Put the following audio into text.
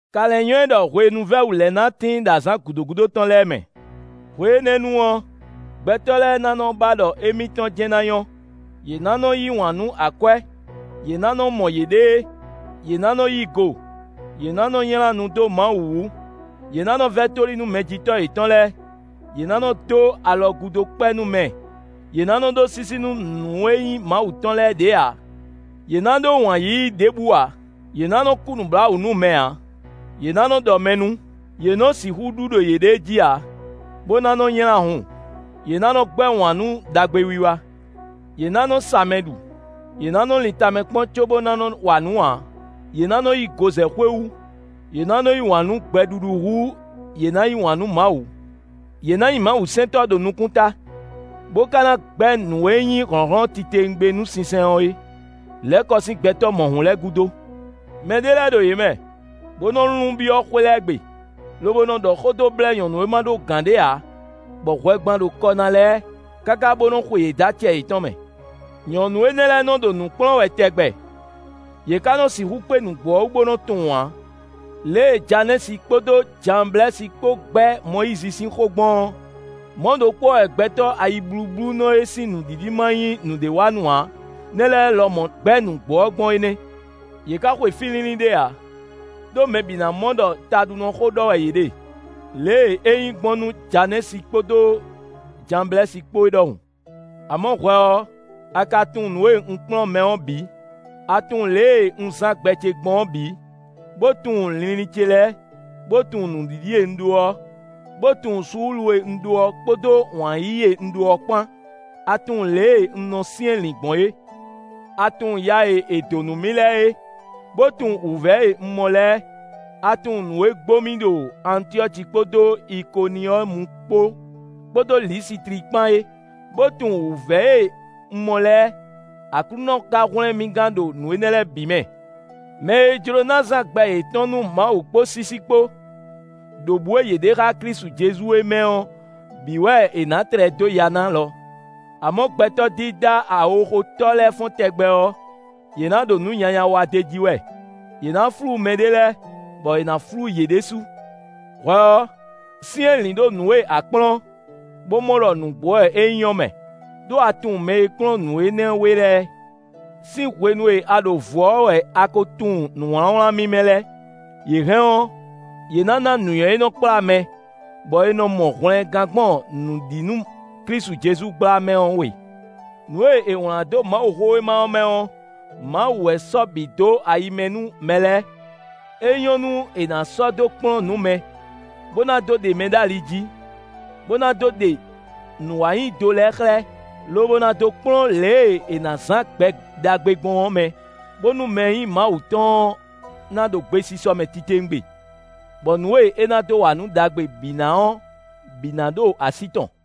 Ka lɛ́ nywɛ́ ɖɔ hwenu vɛ́ wǔ lɛ́ɛ ná tíin ɖo azǎn gǔdo gúdo tɔn lɛ́ɛ mɛ. Hwe énɛ́ nu ɔ́, gbɛtɔ́ lɛ́ɛ ná nɔ ba ɖɔ émítɔn jɛ́n ná nyɔ́; yě ná nɔ yí wǎn nú akwɛ́; yě ná nɔ mɔ yěɖée; yě ná nɔ́ yí go; yě ná nɔ́ nylá nu dó Mawu wú; yě ná nɔ́ vɛ́ tóli nú mɛjitɔ́ yětɔn lɛ́ɛ; yě ná nɔ dó alɔgúdokpɛ́ nú mɛ; yě ná nɔ ɖó sísí nú nǔ e nyí Mawu tɔn lɛ́ɛ ɖě ǎ. Yě ná ɖó wǎn yíyí ɖěbǔ ǎ; yě ná nɔ kú nǔbláwǔ nú mɛ ǎ; yě ná nɔ́ ɖɔ mɛ nú; yě nɔ sixú ɖu ɖo yěɖée jí ǎ, bó ná nɔ nylá hun; yě ná nɔ́ gbɛ́ wǎn nú ɖagbewiwa. Yě ná nɔ́ sa mɛ ɖu; yě ná nɔ́ lin tamɛ kpɔ́n cóbó ná nɔ́ wa nǔ ǎ; yě ná nɔ́ yí go zɛ xwé wú; yě ná nɔ́ yí wǎn nú gbɛɖuɖu hú yě ná yí wǎn nú Mawu. Yě ná nyí mawusɛntɔ́ ɖo nukúnta, bó ka ná gbɛ́ nǔ e nyí hlɔ̌nhlɔ́n titewungbe nú sinsɛn ɔ́ é; lɛ̌ kɔ sín gbɛtɔ́ mɔ̌hun lɛ́ɛ gúdo. Mɛ ɖé lɛ́ɛ ɖo yě mɛ, bó nɔ lun byɔ́ xwé lɛ́ɛ gbe, lobo nɔ ɖɔ xó dó blɛ́ nyɔ̌nu e ma ɖó gǎn ɖě ǎ, bɔ hwɛgban ɖo kɔ ná lɛ́ɛ, káká bó nɔ́ xwe yě dó acɛ yětɔn mɛ. Nyɔ̌nu énɛ́ lɛ́ɛ nɔ ɖo nǔ kplɔ́n wɛ tɛgbɛ, yě ka nɔ sixú kpé nǔgbó ɔ́ wú bó nɔ tunwun ǎ. Lě e Janɛ́si kpódó Janblɛ́si kpó gbɛ́ Mɔyízi sín xó gbɔn ɔ́, mɔ̌ ɖokpó ɔ́ wɛ gbɛtɔ́ ayiblúblúnɔ e sín nǔɖiɖi ma nyí nǔɖé wa nú ǎ nɛ́ lɛ́ɛ lɔmɔ̌ gbɛ́ nǔgbó ɔ́ gbɔn é nɛ́. Yě ka xwe fí línlín ɖé ǎ; ɖó mɛ bǐ ná mɔ ɖɔ taɖunɔxó ɖɔ wɛ yě ɖe, lě e é nyí gbɔn nú Janɛ́si kpódó Janblɛ́si kpó é ɖɔhun. Amɔ̌ hwɛ ɔ́, a ka tunwun nǔ e un kplɔ́n mɛ ɔ́ bǐ; a tunwun lě e un zán gbɛ ce gbɔn ɔ́ bǐ, bó tunwun linlin ce lɛ́ɛ, bó tunwun nǔɖiɖi e un ɖó ɔ́, bó tunwun suúlu e un ɖó ɔ́ kpódó wǎn yíyí e un ɖó ɔ́ kpán. A tunwun lě e un nɔ syɛ́nlǐn gbɔn é. A tunwun ya e è dǒ nú mì lɛ́ɛ é, bó tunwun wǔvɛ́ e un mɔ lɛ́ɛ. A tunwun nǔ e gbo mì ɖo Antyɔ́ci kpódó Ikoniyɔ́mu kpó, kpódó Lisitli kpán é, bó tunwun wǔvɛ́ e un mɔ lɛ́ɛ. Aklúnɔ ka hwlɛ́n mì gán ɖo nǔ énɛ́ lɛ́ɛ bǐ mɛ. Mɛ e jló ná zán gbɛ yětɔn nú Mawu kpó sísí kpó, ɖo bǔ e yě ɖe xá Klísu Jezu é mɛ ɔ́ bǐ wɛ è nǎ tlɛ dó ya ná lɔ. Amɔ̌ gbɛtɔ́ dídá awoxotɔ́ lɛ́ɛ fɔ́n tɛgbɛ ɔ́, yě na ɖo nǔ nyanya wa d'é jí wɛ; yě ná flú mɛ ɖě lɛ́ɛ, bɔ è nǎ flú yě ɖésú. Hwɛ ɔ́, syɛ́nlǐn ɖo nǔ e a kplɔ́n, bó mɔ ɖɔ nǔgbó wɛ é nyí ɔ́ mɛ; ɖó a tunwun mɛ e kplɔ́n nǔ énɛ́ we lɛ́ɛ. Sín hwenu e a ɖo vǔ ɔ́ wɛ a ko tunwun nǔwlánwlán mímɛ́ lɛ́ɛ; yě hɛn ɔ́, yě nǎ ná nǔnywɛ́ e nɔ kplá mɛ, bɔ è nɔ mɔ hwlɛngán gbɔn nǔ ɖi nú Klísu Jezu gbla mɛ ɔ́ we. Nǔ e è wlán dó Mawuxówéma ɔ́ mɛ ɔ́, Mawu wɛ sɔ́ bǐ dó ayi mɛ nú mɛ lɛ́ɛ; é nyɔ́ nú è nǎ sɔ́ dó kplɔ́n nǔ mɛ, bó ná dó ɖe mɛ dó ali jí, bó ná dó ɖe nǔwanyido lɛ́ɛ xlɛ́, lobo ná dó kplɔ́n lě e è nǎ zǎn gbɛ ɖagbe gbɔn ɔ́ mɛ, bónú mɛ e nyí Mawu tɔn ɔ́ ná ɖo gbesisɔ mɛ titewungbe, bɔ nǔ e é ná dó wa nǔ ɖagbe bǐ na ɔ́ bǐ ná ɖo así tɔn.